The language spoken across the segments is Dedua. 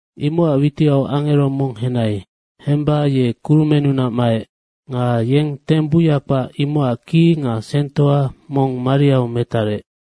Imocac witiau angero mong henai. Hemba ye kurumennunac maec nga yeng teng buya kpac, imocac ki nga sengtoa mong mariau metarec.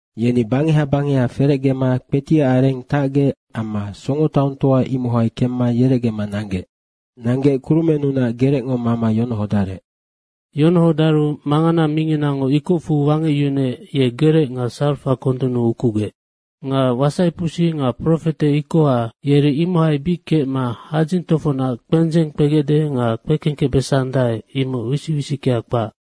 Yeni bangeha bangeha, ferecgema kpetiac areng tacgec amma songotaongtoa, imohai kemma yerecgema nanggec. Nanggec kurumennunac gerecngo mama yonohodarec. Yonohodaru mangana minginango ikocfu wangecyunuec, ye gerec nga sarafa kondunnu ukugec. Nga wasaipusi nga profete ikoha, yeri imohai bic kecma hadzing tofocnac kpendzeng kpegecde nga kpekengkecbesandae, imoc wisic wisickea kpac.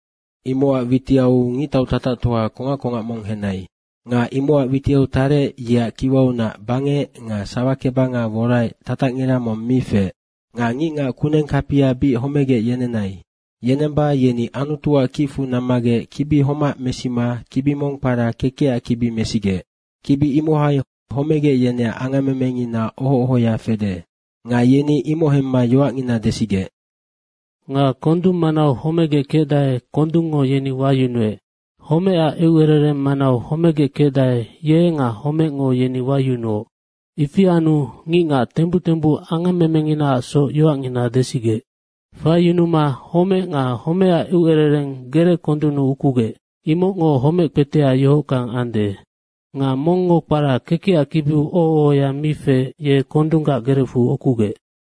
Imocac witiau ngictau tatactoa kongac kongac mong henai. Nga imocac witiau tarec, yeac kiwaunac bangec nga sawakebanga woraec tatacngira mong mi feec. Nga ngicngac kuneng kapia bic homegec yenenai. Yenemba yeni Anutuac kicfu nammagec kibi homac mesima kibi mong kpara Kekecac kibi mesigec, kibi imohai homegec yeneac angammemengina oho ohoya fede. Nga yeni imoc hemma yoacngina desigec. Nga kondung manau homegec kecdae, kondungo yeni wayunuec. Homecac eucerereng manau homegec kecdae, ye nga homecngo yeni wayunuoc. Ifi anu ngicngac tembuc tembuc angammemenginaacsoc yoacngina desigec. Faiyunuma homec nga homecac eucerereng gereckondunnu ukugec. Imocngo homec kpetea yohockang ande. Nga mongngo kpara kekecac kibiu oho ohoya mi feec, ye kondunggac gerecfu ukugec.